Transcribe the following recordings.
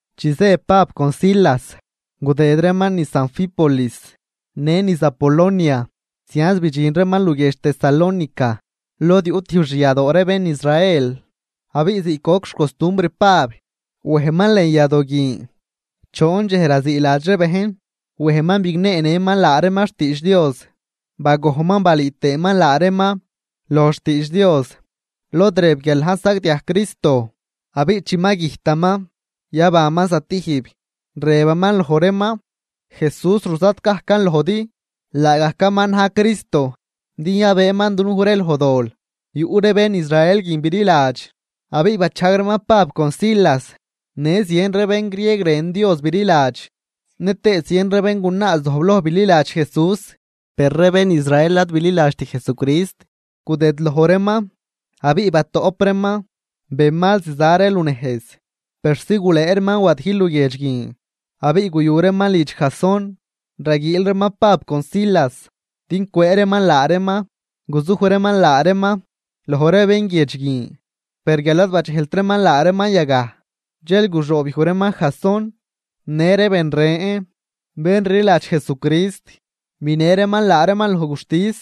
Chi zë Pab con Silas, gudëd reeman niz Anfípolis në niz Apolonia zianz bidxin reeman luguiedx Tesalónica lod yuꞌ tijb xyadoo ree bén Israel. Abiꞌ ziꞌc goc xcostumbr Pab, wejman lën yadoo guin, choon dxej raziiladx ree bejn. Wejman bigneenëman laa reeman xtiidx Dios. Bagojnman balüü tëëman laa reeman loj xtiidx Dios lod rëb guial na̱j sagdiaj Cristo, abiꞌ chi ma güjtaman yabanman stijb. Rëbaman loj reeman: ―Jesús ruzat gajcan lojdi, laagajcaman na̱j Cristo din yabëëman dunuj ree loj dol. Yuꞌ ree bén Israel guin bililadx abiꞌ bachajg reeman Pab con Silas. Në zien ree bén grieg rën Dios bililadx, nëtëë zien ree béngunaa zojbloj bililadx Jesús. Per ree bén Israel ad bililadxt Jesucrist, gudëdloj reeman abiꞌ batoꞌp reeman benmal ziza ree lunejz persi gulëë reeman wadijl luguiedx guin, abiꞌ guyu reeman lidx Jasón, raguiil reeman Pab con Silas din cwëë reeman laa reeman guzuj reeman laa reeman loj ree bén guiedx guin. Per guial ad badxejlt reeman laa reeman yagaj, dxel guxoobyuj reeman Jasón në ree ben ren bén rliladx Jesucrist, binë reeman laa reeman loj guxtis,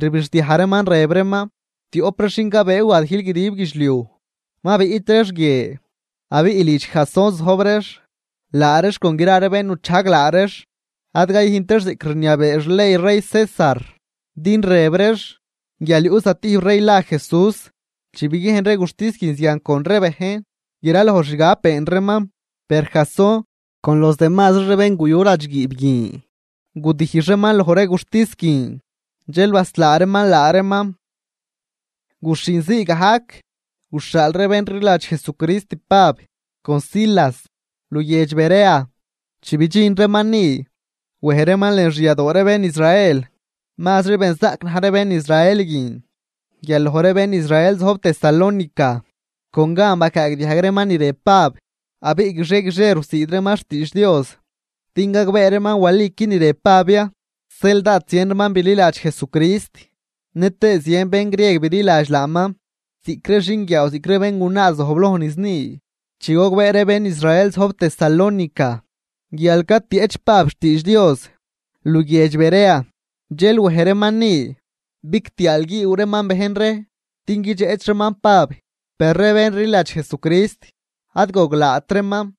rbixdiaj reeman, rëb reeman: ―Tioꞌp ree xin cabëë wadijl guidib guidxliuj, ma biꞌt reex guie, abiꞌ lidx Jasón zojb reex. Laa reex con gra ree bén nuchajg laa reex, ad cayüjnt reex ziꞌc rniabee xley rey César, din rëb reex guial yuꞌ zatijb rey la Jesús. Chi biguiejn ree guxtis guin zian con ree bejn, gra loj xgab been reeman. Per Jasón con los demazri ree bén guyu ladxguiib guin gudijx reeman loj ree guxtis guin, dxel baslaa reeman laa reeman. Guxhinzii gajc, guxhaal ree bén rliladx Jesucrist Pab con Silas luguiedx Berea. Chi bidxin reeman ni, wej reeman lën xyadoo ree bén Israel. Mazri benzaꞌc na̱j ree bén Israel guin guial loj ree bén Israel zojb Tesalónica. Con gan bacaagdiajg reeman ni rëb Pab. Abiꞌ guixie guixie rusiid reeman xtiidx Dios, din gagbee reeman waliqui ni rëb Pab ya. Zeel dád zien reeman bililadx Jesucrist, nëtëë zien bén grieg bililadx laaman ziꞌc ree xinguiaaw ziꞌc ree béngunaa zojbloj niz ni. Chi gogbee ree bén Israel zojb Tesalónica guial catieꞌch Pab xtiidx Dios luguiedx Berea, dxel wej reeman ni bigtiaalguiiw reeman bejn ree din guidxeꞌch reeman Pab. Per ree bén rliladx Jesucrist ad goglaat reeman,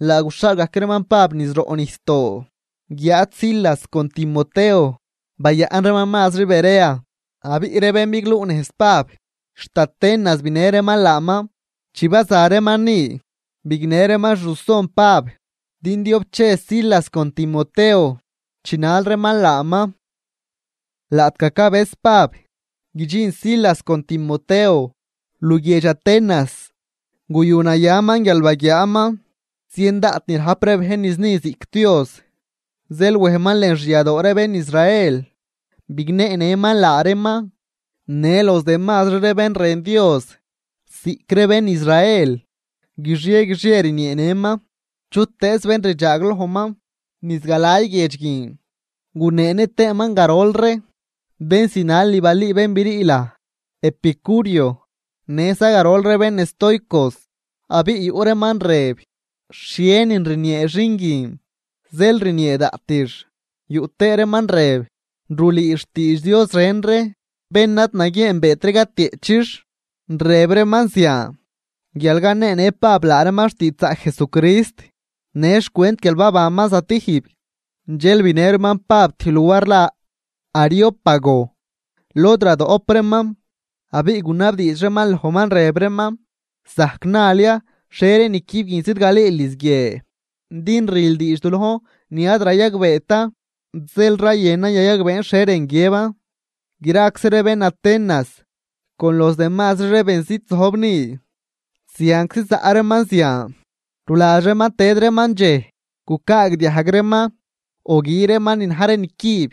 laa guxhaal gajc reeman Pab niz roꞌ nijsdoo. Guiáad Silas con Timoteo bayaꞌn reeman mazri Berea. Abiꞌ ree bén bigluꞌnejz Pab, xt Atenas binë reeman laaman. Chi baza reeman ni, bignë reeman xruson Pab din diob che Silas con Timoteo chinal reeman laaman. Laꞌtgaj cabëz Pab guidxin Silas con Timoteo luguiedx Atenas, guyunayaman guial baguiaaman zien daꞌt ni rajp ree bejn niz ni ziꞌc dios. Zeel wejman lën xyadoo ree bén Israel bigneenëman laa reeman në los demazri ree bén rën Dios ziꞌc ree bén Israel, guixie guixie rnieenëman chutëëz bén rdxaaglojman niz galay guiedx guin. Guneenë tëëman garol ree bén zinal ni balüü bén brii laj epicureo, në za garol ree bén estoicos. Abiꞌ yuꞌ reeman rëb: ―¿Xhienin rniee xin guin zeel rniee daꞌtix? Yuꞌ tëë reeman rëb: ―Rulüü xtiidx dios ren ree bén ad naguieenbeet ree catieꞌchix. Rëb reeman zian guial caneenë Pab laa reeman xtiidxzaꞌc Jesucrist në xcwent guial babanman stijb. Dxel binë reeman Pab tijb luar la Areópago, lod radoꞌp reeman. Abiꞌ gunabdiidx reeman lojman, rëb reeman: ―¿Zajc nal ya xhie ree nicüb guin zidgalüül niz guie? Din rül diidx du lojn ni ad rayagbeetan, zeel rayënan yayagbeen xhie rën guiëban. Graczi ree bén Atenas, con los demazri ree benzit zojb ni, zianczi zaꞌ reeman zian. Ruladx reeman tëd reeman dxej, gucaagdiajg reeman o gü reeman ni na̱j ree nicüb.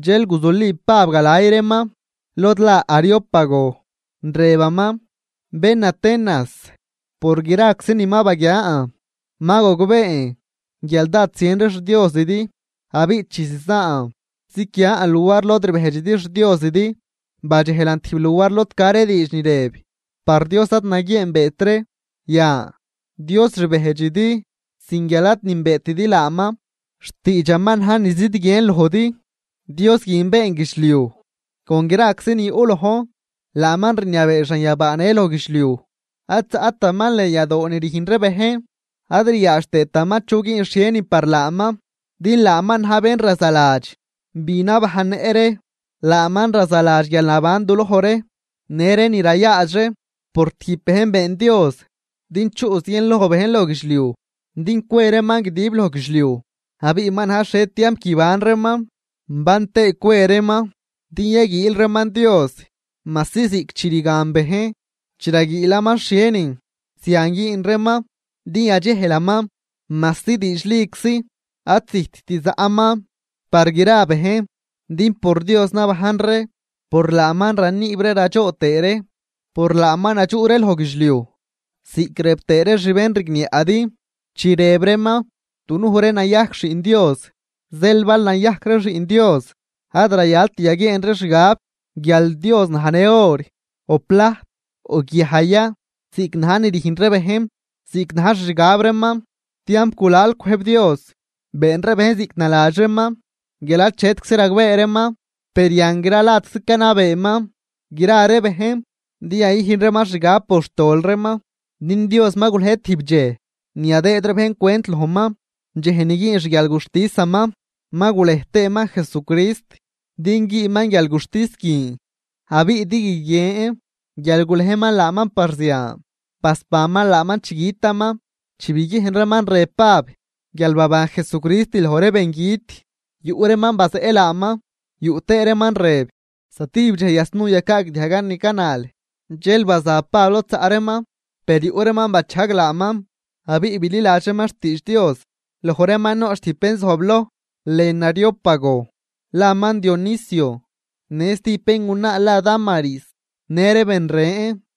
Dxel guzuli Pab galay reeman lod la Areópago, rëbaman: ―Bén Atenas, por graczi ni ma baguian, ma gogbeen guial dád zien ree xdiosidi. Abiꞌ chi zizaan ziquian luar lod rbejdxidi xdiosidi, badxejlan tijb luar lod ca ree diidx ni rëb: “Par Dios ad naguieenbeet ree.” Yan, Dios rbejdxidi sin guial ad nünbeetidi laaman, xtiidxaman na̱j ni zidguien lojdi. ’Dios guin been guidxliuj con graczi ni yuꞌ lojn, laaman rniabee xanyabaa në loj guidxliuj. Ad zaꞌtaman lën yadoo ni rüjn ree bejn. Ad riaadx tëëtaman chu güün xhienin par laaman, din laaman na̱j bén razaladx bi nabajnnëꞌ ree, laaman razaladx guialnaban duloj ree në ree ni rayaadx ree. ’Por tijb bejn been Dios din chuꞌ zienloj bejn loj guidxliuj din cwe reeman guidib loj guidxliuj. Abiꞌ ma na̱j xhie tiamp guiban reeman ban tëë cwe reeman. Din yaguiil reeman Dios majsi ziꞌc chi rgan bejn chi raguiilaman xhienin, zian güün reeman din yadxejlaman. Majsi diidxliczi ad zijtt zaꞌman par gra bejn. Din por Dios nabajn ree, por laaman raniib ree radxoo tëë ree, por laaman nadxuꞌ ree loj guidxliuj. Ziꞌc rëb tëë ree xbénrigniaꞌdi, chi rëb reeman: “Dunuj ree nayajc xiꞌn Dios.” Zeel bal nayajc ree xiꞌn Dios, ad rayalt yaguieen ree xgab guial Dios najnë or, o plajt, o guiaj ya ziꞌc na̱j ni rüjn ree bejn ziꞌc na̱j xixgab reeman. Tiamp gulal cwëjb Dios been ree bejn ziꞌc naladx reeman guial achetczi ragbee reeman, per yan gra ladczi canabeeman gra ree bejn din yayüjn reeman xgab por xtol reeman. Din Dios ma gulej tijb dxej ni yadëëd ree bejn cwent lojman, dxej ni güün xguialguxtisaman. Ma gulej tëëman Jesucrist din güünman guialguxtis guin, abiꞌ din guiguien guial gulejman laaman par zian, basbanman laaman chi gütaman. Chi biguiejn reeman rëb Pab guial baban Jesucrist loj ree bengüt, yuꞌ reeman bazeꞌ laaman, yuꞌ tëë reeman rëb: ―¡Zatijb dxej yasnuu yacaagdiajgan ni canal! Dxel baza Pab lod zaꞌ reeman. Per yuꞌ reeman bachajg laaman, abiꞌ bililadx reeman xtiidx Dios. Loj reeman noꞌch tijb bén zojbloj lën Areópago laman Dionisio, në stijb béngunaa la Dámaris në ree ben ren.